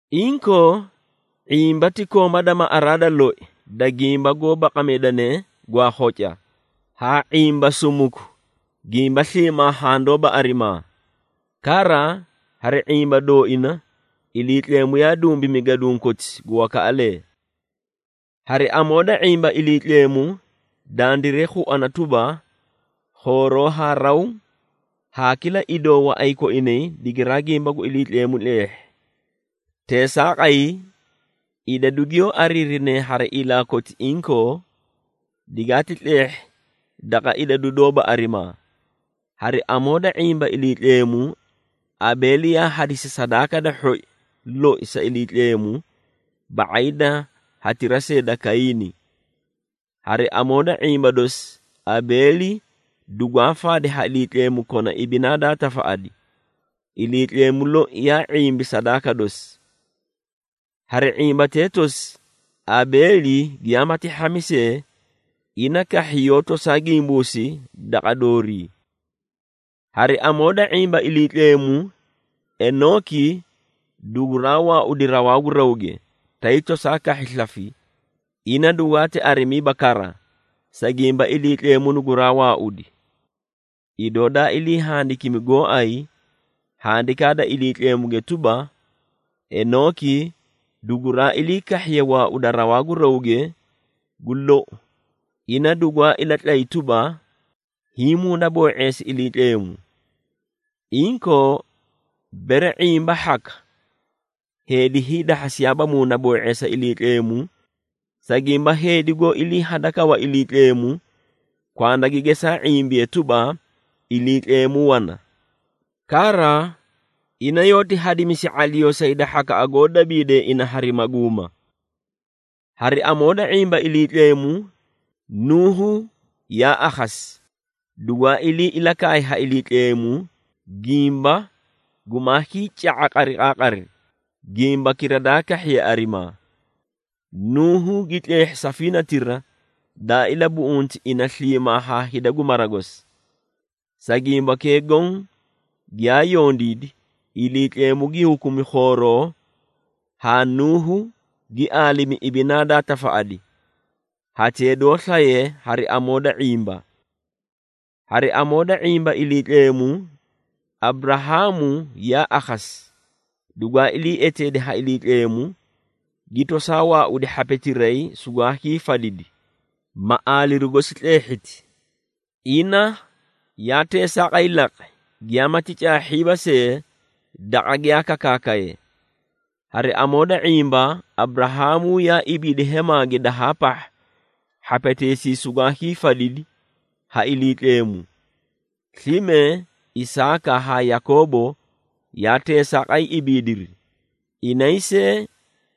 Inkoo, ⁄imba ti kooma da maꞌaraa da loi da gimba goó baqamidane, gwaa khoca, haa ⁄imba sumuku gimba sliimaa handoóba arimaa. Kara, hari ⁄imba dooina, Iliitleemu yaa dumbimi gaduũ koti gu wakaꞌalee. Hari amoo da ⁄imba Iliitleemu, dandiray khuana tuba, khooroo haa raw, haa kila idoo waꞌay koinay digiraa gimba gu Iliitleemu tleehhi. Teesaaqay, idadu giyoó ariirine hari ilaa koti inkoo, digaati tleehhi daqa idadu doóba arimaa. Hari amoo da ⁄imba Iliitleemu, Abeeli yaa hadisi sadaaka da hhoi loi sa Iliitleemu ba⁄ay da hatira see da Kayiini. Hari amoo da ⁄imba dosi, Abeeli dugwaa faadi ha Iliitleemu kona ibinaa daa tafaꞌadi. Iliitleemu loi yaa ⁄imbi sadaaka dosi. Hari ⁄imbatee tosi, Abeeli giyaamati hhami see, ina kahhi yoó tosaa gimbuusi daqa doorii. Hari amoo da ⁄imba Iliitleemu, Enooki duguraa waaudi rawaa gu rawge, tay tosaa kahhi slafi, ina dugwaa arimiiba kara, sa gimba Iliitleemu guraa waaudi. Idoo daa ilii handikimi gooay Handikaa da Iliitleemuge tuba, Enooki duguraa ilii kahhiye waauda rawaa gu rawge, gu lou ina dugwaati ilatlay tuba, hiĩ muunaboo⁄eesi Iliitleemu. Inkoo, bere ⁄imba hhaka, heedi hiidahhasiyaaba muunaboo⁄eesa Iliitleemu, sa gimba heedi goó iliihhadakawa Iliitleemu, kwanda gi gesaa ⁄imbiye tuba, Iliitleemu wana. Kara, ina yoóti hadimisi ⁄aliyoo sa hida hhakaꞌa goó dabiidee ina hari maguuma. Hari amoo da ⁄imba Iliitleemu, Nuuhu yaa akhasi, dugwaa ilii ilakaay ha Iliitleemu gimba gumaa hiica⁄a qariqaaqari, gimbakira daa kahhiye arimaa. Nuuhu gi tleehhi safiinatira daa ilabuꞌunti ina sliimaa haa hida gu mara gosi. Sa gimbakee goõ giyaa yondiidi, Iliitleemu gi hukumi khooroo haa Nuuhu gi aalimi ibinaa daa tafaꞌadi, hatee doó slaye hari amoo da ⁄imba. Hari amoo da ⁄imba Iliitleemu, Aburahaamu yaa akhasi, dugwaa ilii eteedi ha Iliitleemu, gi tosaa waaudi hhapetiray sugwaa hiifadidi, ma aaliru gosi tleehhiti. Ina yaa teesaaqay laqi, giyaamati caahhiiba see daqa giyaa kakaakaye. Hari amoo da ⁄imba, Aburahaamu yaa ibiidi hemaage dahaa pahha hhapeteesii sugwaa hiifadidi ha Iliitleemu. Slime, Isaaka haa Yakoobo yaa teesaaqay ibiidiri, inay see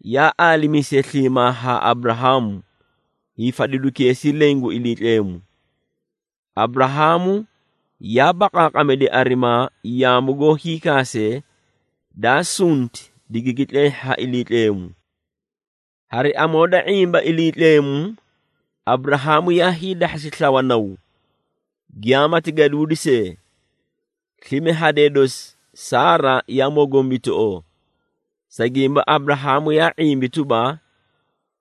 yaa aalimiisee sliimaa haa Aburahaamu, hiifadidukeesii leẽ gu Iliitleemu. Aburahaamu yaa baqaaqamidi arimaa yaamu goó hiikaasee, daa sunti digigi tleehhi ha Iliitleemu. Hari amoo da ⁄imba Iliitleemu, Aburahaamu yaa hiidahhasi slawa naw, giyaamati gaduudi see. Slime hadee dosi Saara yaa mogombitoꞌoo, sa gimba Aburahaamu yaa ⁄imbi tuba,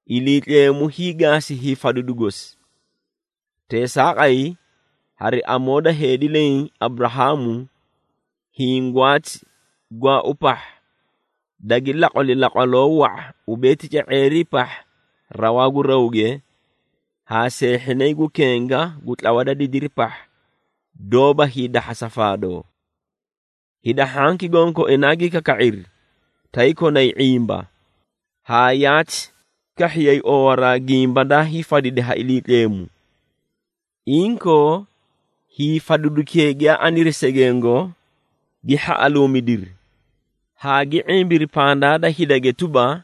Iliitleemu hiigaasi hiifadidu gosi. Teesaaqay, hari amoo da heedi leẽ, Aburahaamu, hiĩ gwaati gwaau pahha, dagi laqwali laqwaloo wa⁄a ubee tica⁄eerii pahha rawaa gu rawge haa seehhinay gu kenga gu tlawa da didiri pahha, doóba hiidahhasa faadoo. Hida hhanki gonkoinaa gi kaka⁄iri tay konay ⁄imba, haa yaati kahhiyay oowaraa gimba daa hiifadidi ha Iliitleemu. Inkoo, hiifadidukee giyaa aniri segengo, gi hhaꞌaluumidiri, haa gi ⁄imbiri pandaa da hidage tuba,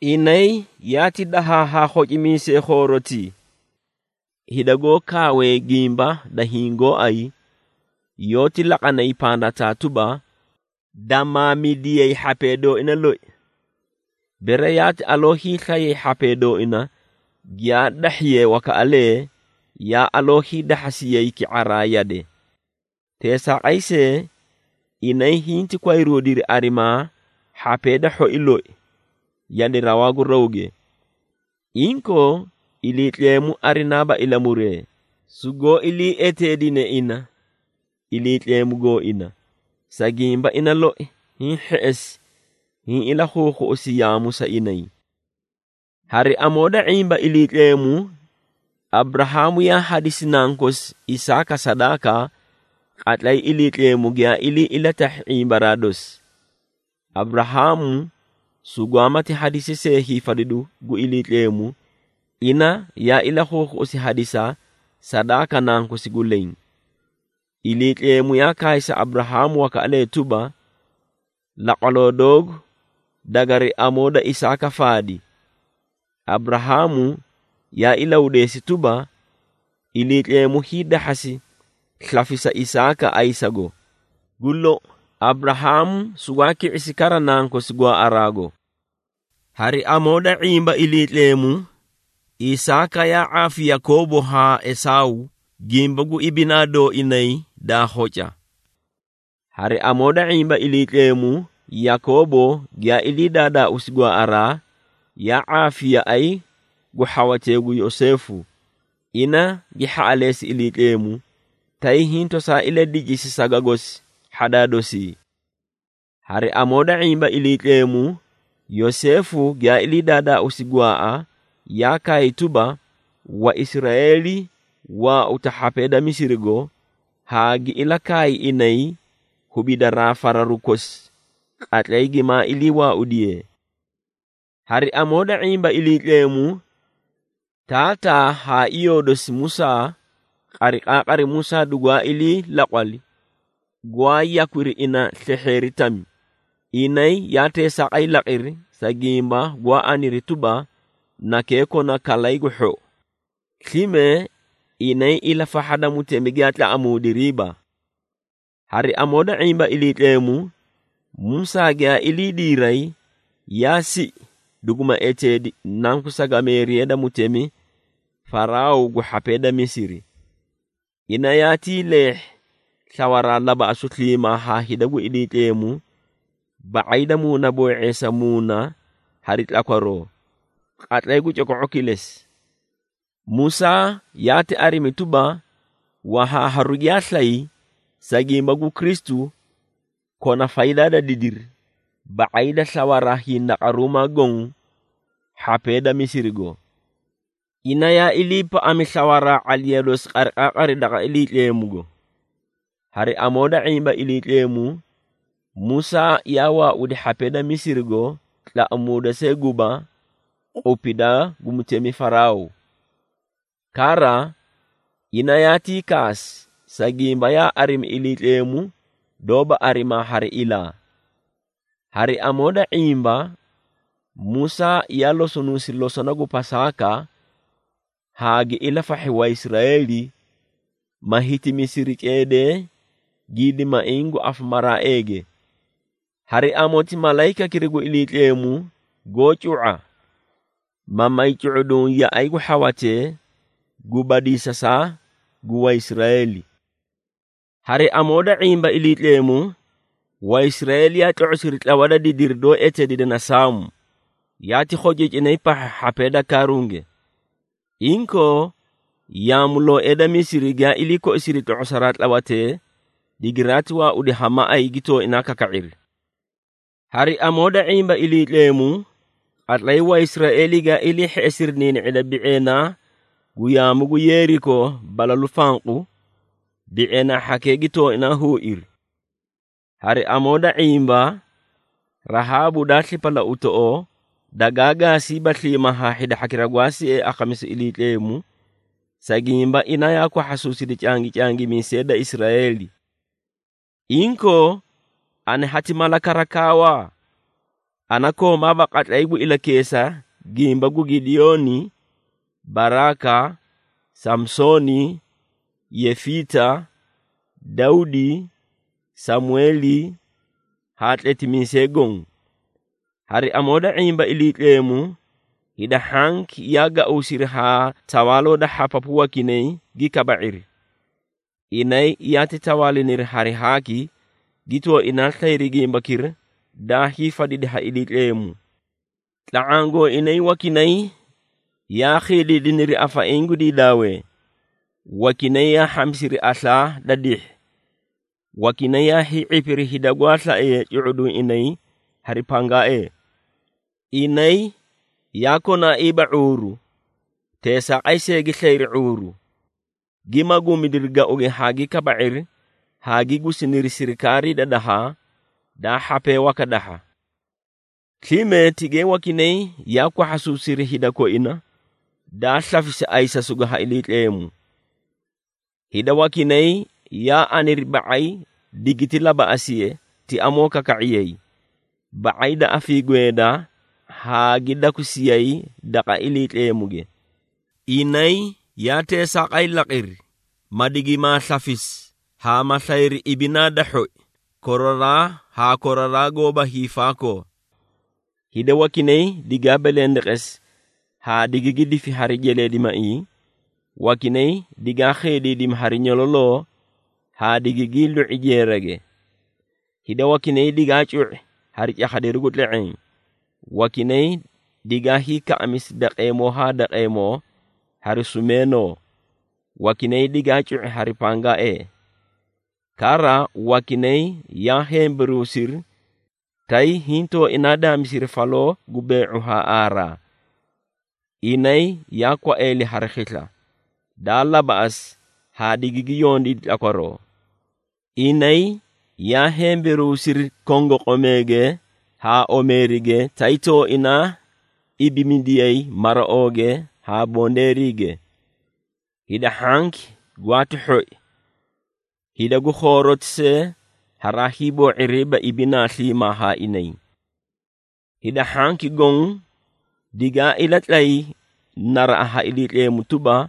inay yaati dahaa haa khocimiisee khoorotii. Hida goó kaawee gimba da hiĩ gooay, yoóti laqanay pandataa tuba, damaamidiyay hhapee dooina loi. Bere yaati aloo hiislayay hhapee dooina giyaa dahhiyee wakaꞌalee, yaa aloo hiidahhasiyay ki⁄araa yade. Teesaaqay see, inay hinti kwayruudiri arimaa hhapee da hhoi loi, yade rawaa gu rawge. Inkoo, Iliitleemu arinaaba ilamuree, sugoó ilii eteedine ina, Iliitleemu gooina, sa gimba ina loi hiĩ hheꞌesi hiĩ ilakhuukhuꞌusi yaamu sa inay. Hari amoo da ⁄imba Iliitleemu, Aburahaamu yaa hadisi nankosi Isaaka sadaaka, qatlay Iliitleemu giyaa ilii ilatahhi ⁄imbaraa dosi. Aburahaamu sugwaamati hadisi see hiifadidu gu Iliitleemu, ina yaa ilakhuukhuꞌusi hadisa sadaaka nankosi gu leẽ. Iliitleemu yaa kaay sa Aburahaamu wakaꞌalee tuba, “Laqwaloo doogu dagari amoo da Isaaka faadi.” Aburahaamu yaa ilahudeesi tuba, Iliitleemu hiidahhasi slafisa Isaaka ayisago. Gu lou, Aburahaamu sugwaa ki⁄isi kara nankosi gwaaꞌaraago. Hari amoo da ⁄imba Iliitleemu, Isaaka yaa ⁄aafi Yakoobo haa Esaaw gimba gu ibinaa dooinay daa khoca. Hari amoo da ⁄imba Iliitleemu, Yakoobo giyaa ilii daadaausi gwaaꞌaraa, yaa ⁄aafi yaꞌay gu hhawatee gu Yoseefu. Ina gi hhaꞌaleesi Iliitleemu, tay hiĩ tosaa iladicisi saga gosi hhadaa dosii. Hari amoo da ⁄imba Iliitleemu, Yoseefu giyaa ilii daadaausi gwaaꞌa, yaa kaay tuba, Waisraeeli waauta hhapee da Misirigo, haa gi ilakaay inay hubidaraa fararu kosi qatlay gimaa ilii waaudiyee. Hari amoo da ⁄imba Iliitleemu, taataa haa iyoo dosi Musaa, qariqaaqari Musaa dugwaa ilii laqwali, gwaa yakwiri ina slehheeri tami. Inay yaa teesaaqay laqiri, sa gimba gwaa aniri tuba, nakee kona kalay gu hhou. Slime, inay ilafahha da mutemi giyaa tlaꞌamuudiriiba. Hari amoo da ⁄imba Iliitleemu, Musaa giyaa ilii diiray, yaa siꞌi duguma eteedi nanku sagameeriya da mutemi Faraaw gu hhapee da Misiri. Ina yaatii leehhi slawaraa labaꞌasu sliimaa haa hida gu Iliitleemu, ba⁄ay da muunaboo⁄eesa muuna hari tlakwaroo, qatlay gu coko⁄o kilesi. Musaa yaati arimi tuba, wahaaharu giyaa slay, sa gimba gu Kristu, kona faydaa da didiri, ba⁄ay da slawaraa hindaqaruumaa goõ hhapee da Misirigo. Ina yaa iliipaꞌami slawaraa ⁄aliya dosi qariqaaqari daqa Iliitleemugo. Hari amoo da ⁄imba Iliitleemu, Musaa yaa waaudi hhapee da Misirigo tlaꞌamuuda see guba qupidaa gu mutemi Faraaw. Kara, ina yaatii kaasi, sa gimba yaa arimi Iliitleemu doóba arimaa hari ilaa. Hari amoo da ⁄imba, Musaa yaa losonuusi losona gu Pasaaka haa gi ilafahhi Waisraeeli, ma hitimisiri ceedee gidimaiĩ gu afamaraaeege. Hari amoti malayikakira gu Iliitleemu goó cu⁄a, ma may cu⁄uduũ yaꞌay gu hhawatee gu badiisasaa gu Waisraeeli. Hari amoo da ⁄imba Iliitleemu, Waisraeeli yaa tlo⁄osiri tlawa da didiri doó eteedine na Saamu, yaati khociicinay pahha hhapee da kaaruuge. Inkoo, yaamulooee da Misiri giyaa ilii koisiri tlo⁄osaraa tlawatee, digiraati waaudi ha maꞌay gi tooinaa kaka⁄iri. Hari amoo da ⁄imba Iliitleemu, qatlay Waisraeeli giyaa ilii hheꞌesiri niini⁄ida bi⁄eenaa gu yaamu gu Yeeriko balalu fanqu, bi⁄eenaa hhakee gi tooinaa huuiri. Hari amoo da ⁄imba, Rahaabu daa slipalauutoꞌoo dagaa gaasiiba sliimaa haa hida hhakira gwaa siee akhamisu Iliitleemu, sa gimba ina yaa kwahhasuusidi cangicangimiisee da Israeeli. Inkoo, ana hati mala kara kaawa? Ana koomaaba qatlay gu ilakeesa gimba gu Gidiyooni, Baraaka, Saamsooni, Yefiita, Dawdi, Samweeli haa tletimiisee goõ. Hari amoo da ⁄imba Iliitleemu, hida hhanki yaa gauusiri haa tawaaloo da hhapapu wakinay gi kabairi. Inay yaati tawaaliniri hari haaki, gi tooinaa slayri gimbakira daa hiifadidi ha Iliitleemu. Tla⁄aã gooinay wakinay yaa khiidiidiniri afaiĩ gu diidaawee, wakinay yaa hhamisiri aslaa da dihhi, wakinay yaa hii⁄ipiri hida gwaa slaee cu⁄uduũ inay hari pangaaee. Inay yaa konaaiiba ⁄uuru, teesaaqay see gi slayri ⁄uuru, gi maguumidiri gauge haa gi kaba⁄iri haa gi gusiniri sirikaarii da dahaa, daa hhapee waka dahha. Slime tigay wakinay yaa kwahhasuusiri hida koina daa slafisi ayisasugo ha Iliitleemu. Hida wakinay yaa aniri ba⁄ay digiti labaꞌasiye ti amoo kaka⁄iyay, ba⁄ay da afiigweeda haa gi dakusiyay daqa Iliitleemuge. Inay yaa teesaaqay laqiri, ma digimaa slafisi haa ma slayri ibinaa da hhoi koraraa haa koraraa goóba hiifaakoo. Hida wakinay digaa belendeqesi haa digigi difi hari jeleedimaiĩ, wakinay digaa khiidiidimi hari nyololoo haa digigii lu⁄i jeerage. Hida wakinay digaa cu⁄i hari cakhadiru gu tle⁄eẽ, wakinay digaa hiikaꞌamisi daqeemoo haa daqeemoo hari sumeenoo, wakinay digaa cu⁄i hari pangaaee. Kara, wakinay yaa hemberuusiri, tay hintooina daamisiri faloo gu bee⁄u haa aaraa. Inay yaa kwaeeli hari khisla, daa labaꞌasi haa digigi yondiidi tlakwaroo. Inay yaa hemberuusiri kongoqomeege haa omeerige, tay tooinaa ibimidiyay maraooge haa bondeeriige. Hida hhanki gwaati hhoi, hida gu khooroti see haraa hiiboo⁄iriiba ibinaa sliimaa haa inay. Hida hhanki goõ digaa ilatlay naraꞌa ha Iliitleemu tuba,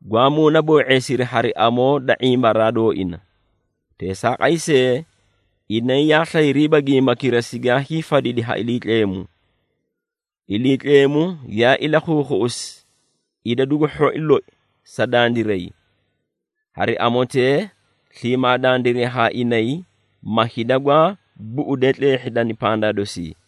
gwaa muunaboo⁄eesiri hari amoo da ⁄imbaraa dooina. Teesaaqay see, inay yaa slayriiba gimbakira sigaa hiifadidi ha Iliitleemu. Iliitleemu yaa ilakhuukhuꞌusi idadu gu hhoi loi sa dandiray. Hari amotee, sliimaa dandiray haa inay, ma hida gwaa buꞌudee tleehhidani pandaa dosii.